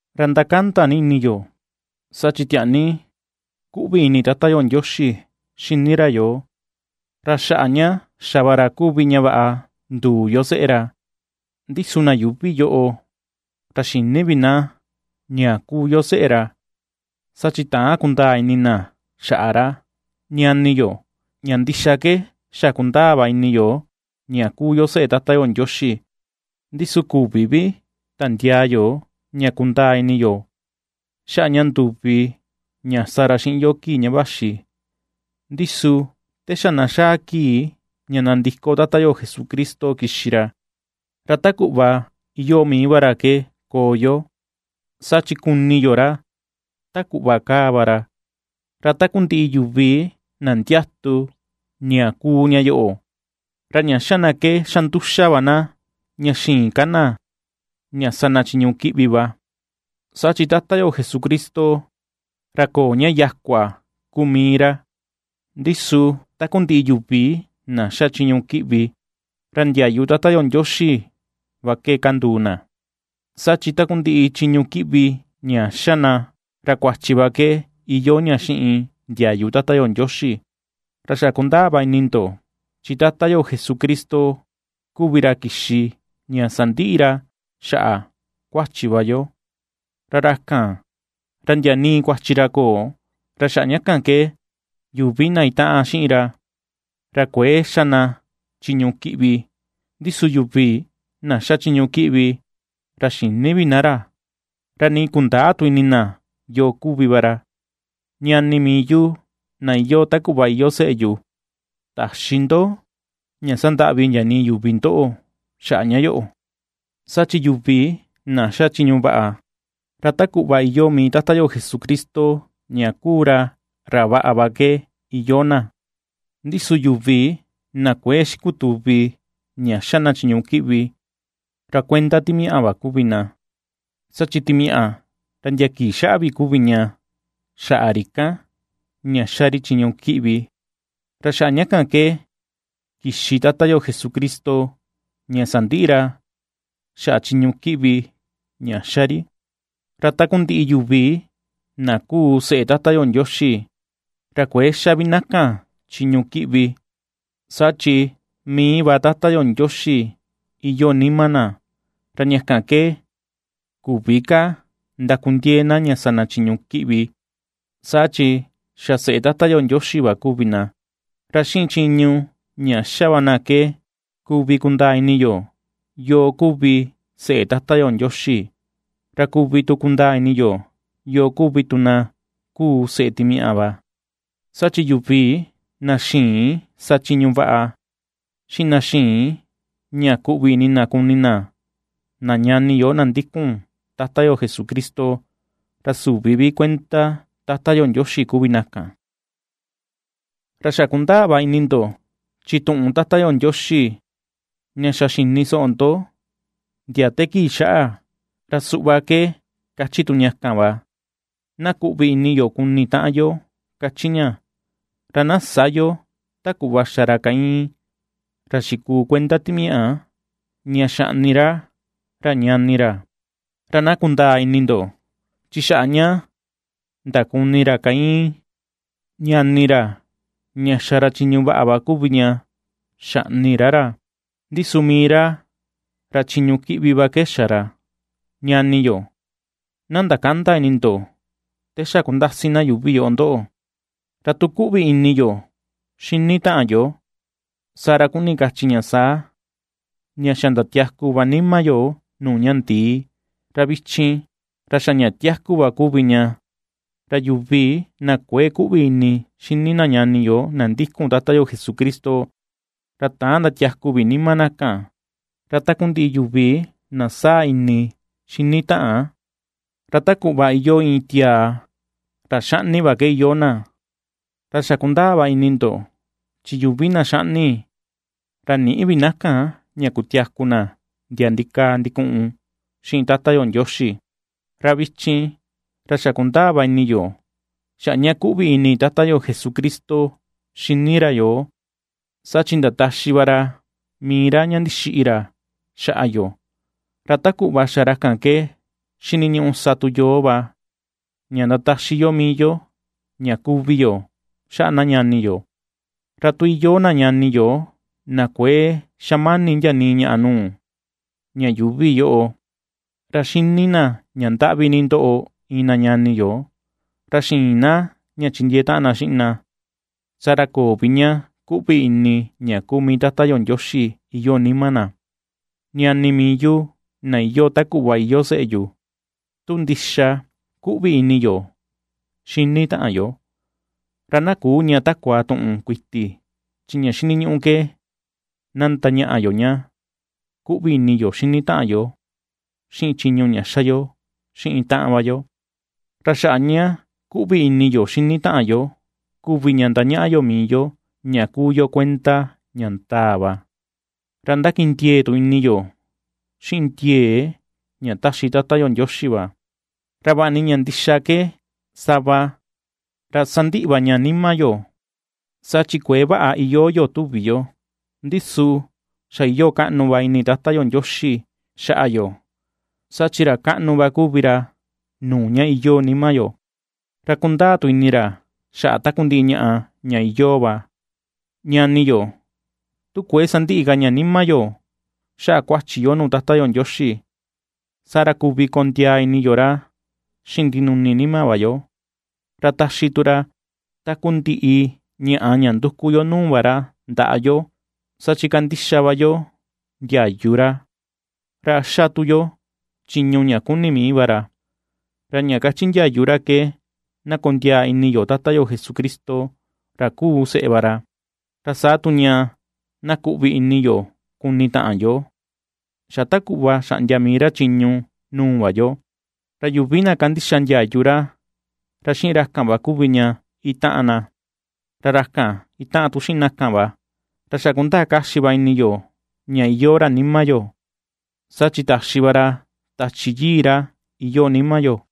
Ra ndakanda ni ini yo, saa chi tiaa ni ^kuꞌvi ini Tata yo Ndioxi xini ra yoo, ra xaꞌa ña xa va ra kuvi ña vaꞌa nduu yo seꞌe ra. Ndi su na yuuvi yoꞌo ra xïni vi na ña kuu yo seꞌe ra, saa chi täan kundaa ini na xaꞌa ra. Ñani yo, ña ndixa ke xa kundaa va ini yo ña kuu yo seꞌe Tata yo Ndioxi, ndi su küvi vi tandiaa yo ña kundaa ini yo xaꞌa ña nduvi ña sa ra xiꞌin yo kii ña vaxi, ndi su te xa na xaa kii ña nandiko Tata yo Jesucristo kixi ra, ra ta kuꞌva iyoo mii va ra ke koo yo, saa chi kuni yo ra ta kuꞌva kaa va ra. Ra takundiꞌi yuvi na ndiatu ña kuu ña yoꞌo, ra ña ^xa na ke xa nduxa va na ña xïin ka na ña sa na chiñu kiꞌvi va, saa chi Tata yo Jesucristo, ra köo ña yakua kuu mii ra. Ndi su takundiꞌi yuvi na xa chiñu kiꞌvi, ra ndiayu Tata yo Ndioxi va ke kanduu na, saa chi takundiꞌi chiñu kiꞌvi ña xa na, ra kuachi va ke iyoo ña xiꞌin ndiayu Tata yo Ndioxi. Ra xa̱ ^kundaa va ini ndo, chi Tata yo Jesucristo kuvi ra kixi ña sandiꞌi ra xaꞌa kuachi va yo, ra ra kan, ra ndia nii kuachi ra köo. Ra xaꞌa ña kan ke yuvi na itaꞌan xiꞌin ra, ra kuëe xa ka na chiñu kiꞌvi; ndi su yuvi na xa chiñu kiꞌvi, ra xïni vi na ra, ra nii kundäa tu ini na yoo kuvi va ra. Ñani mii yu, na iyoo ta kuꞌva iyoo seꞌe yu, täxi ndo ña sandaꞌvi ndia nii yuvi ndoꞌo xaꞌa ña yoꞌo; saa chi yuvi na xa chiñu vaꞌa, ra ta kuꞌva iyoo mii Tata yo Jesucristo ña kuu ra ra vaꞌa ke iyoo va na. Ndi su yuvi na kuëe xikutuvi ña ^xa na chiñu kiꞌvi, ra kuenda timiaꞌa va kuvi na, saa chi timiaꞌa ra ndia kii xaꞌa vi kuvi ña xaꞌa ri kan, ña ^xa ri chiñu kiꞌvi. Ra xaꞌa ña kan ke kixi Tata yo Jesucristo ña sandiꞌi ra xaꞌa chiñu kiꞌvi ña ^xa ri. Ra takundiꞌi yuvi na kúú seꞌe Tata yo Ndioxi, ra kuëe xa vi na kan chiñu kiꞌvi, saa chi mii va Tata Ndioxi iyoo nima na; ra ña kan ke küvi ka ndakundiee na ña sa na chiñu kiꞌvi, saa chi xa seꞌe Tata yo Ndioxi va kuvi na. Ra xiꞌin chiñu ña xa va na ke kuvi kundaa ini yo yoo kuvi seꞌe Tata yo Ndioxi, ra kuvi tu kundaa ini yo yoo kuvi tu na kuu seꞌe timiaꞌa va, saa chi yuvi na xïin sa chiñu vaꞌa, xiꞌin na xïin ña kuꞌvi ini na kuni na na ñani yo na ndikun Tata yo Jesucristo, ra süvi vi kuenda Tata yo Ndioxi kuvi na kan. Ra xa kundaa va ini ndo chi tuꞌun Tata yo Ndioxi ña xa xini soꞌo ndo ndia te kii xaꞌa, ra suꞌva ke kachi tu ña kan va: Na kuꞌvi ini yo kuni taꞌan yo, kachi ña. Ra na sä yo ta kuꞌva xa ra Caín, ra xikuu kuenda timiaꞌa, ña xaꞌni ra ra ñani ra. Ra na kundaa ini ndo, chi xaꞌa ña ndakuni ra Caín ñani ra ña xa ra chiñu vaꞌa kuvi ña xaꞌni ra ra, ndi su mii ra ra chiñu kiꞌvi va ke xa ra. Ñani yó, na ndakända ini ndo te xa kundasi na yuuvi yoꞌo ndoꞌo. Ra tu kuꞌvi ini yo xini taꞌan yo, saa ra kuni kachi ña saa, ña xa ndatiaku va nima yo nuu ña ndii, ra vichin ra xa ña tiaku va kuvi ña. Ra yuvi na kuëe kuꞌvi ini xini na ñani yo na ndikun Tata yo Jesucristo, ra täan ndatiaku vi nima na kan. Ra takundiꞌi yuvi na saa ini xini taꞌan, ra ta kuꞌva iyoo iin tiaa ra xaꞌni va ke iyoo na, ra xa kundaa va ini ndo, chi yuvi na xaꞌni, ra nïꞌi vi na kan ña kutiaku na ndia ndikaa ndikuꞌun xiꞌin Tata yo Ndioxi. Ra vichin, ra xa̱ ^kundaa va ini yo xaꞌa ña kuꞌvi ini Tata yo Jesucristo xini ra yoo, saa chi ndataxi va ra mii ra ña ndixiꞌi ra xaꞌa yo; ra ta kuꞌva xa ra kan ke xiniñuꞌu sa tu yoo va ña ndataxi yo mii yo ña kuvi yo xaꞌa na ñani yo. Ra tu iyoo na ñani yo na kuëe xamani ndia nii ñaꞌa nuu ña yuuvi yoꞌo, ra xini na ña ndaꞌvi ni ndoꞌo iin na ñani yo, ra xïin na ña chindiee taꞌan na xiꞌin na, saa ra köo vi ña kuꞌvi ini ña kuu mii Tata yo Ndioxi iyoo nima na. Ñani mii yu, na iyoo ta kuꞌva iyoo seꞌe yu, tu ndixa kuꞌvi ini yo xini taꞌan yo, ra na küu ña takua tuꞌun kuiti, chi ña xiniñuꞌu ke na ndañaꞌa yo ña kuꞌvi ini yo xini taꞌan yo xiꞌin chiñu ña xa yo xiꞌin taꞌan va yo. Ra xaꞌa ña kuꞌvi ini yo xini taꞌan yo kuvi ña ^ndañaꞌa yo mii yo ña kuu yo kuenda ña ndaa va; ra ndakindiee tu ini yo xiꞌin ndiee ña taxi Tata yo Ndioxi va. Ra vaꞌa ni ña ndixa ke sava ra sandiꞌi va ña nima yo saa chi kuëe vaꞌa iyoo yo tuvi yo, ndi su xa iyoo kaꞌnu va ini Tata yo Ndioxi xaꞌa yo, saa chi ra kaꞌnu va kuvi ra nuu ña iyoo nima yo, ra kundaa tu ini ra xaꞌa takundiꞌi ñaꞌa ña iyoo va. Ñani yo, tu kuëe sandiꞌi ka ña nima yo xaꞌa kuachi yo nuu Tata yo Ndioxi, saa ra kuvi kondiaa ini yo ra xiꞌin ndinuni nima va yo, ra taxi tu ra takundiꞌi ñaꞌa ña nduku yo nuu va ra ndaꞌa yo, saa chi kandixa va yo ndiayu ra, ra xa tu yo chiñu ña kuni mii va ra. Ra ña kachi ndiayu ra ke na kondiaa ini yo Tata yo Jesucristo, ra kuu seꞌe va ra, ra saa tu ña na kuꞌvi ini yo kuni taꞌan yo, xa ta kuꞌva xaꞌndia mii ra chiñu nuu va yo. Ra yuvi na kandixa ndiayu ra, ra xiꞌin ra kan va kuvi ña itaꞌan na, ra ra kan itaꞌan tu xiꞌin na kan va. Ra xa kundaa kaxi va ini yo ña iyoo ra nima yo, saa chi taxi va ra Tachi Yii ra iyoo nima yo.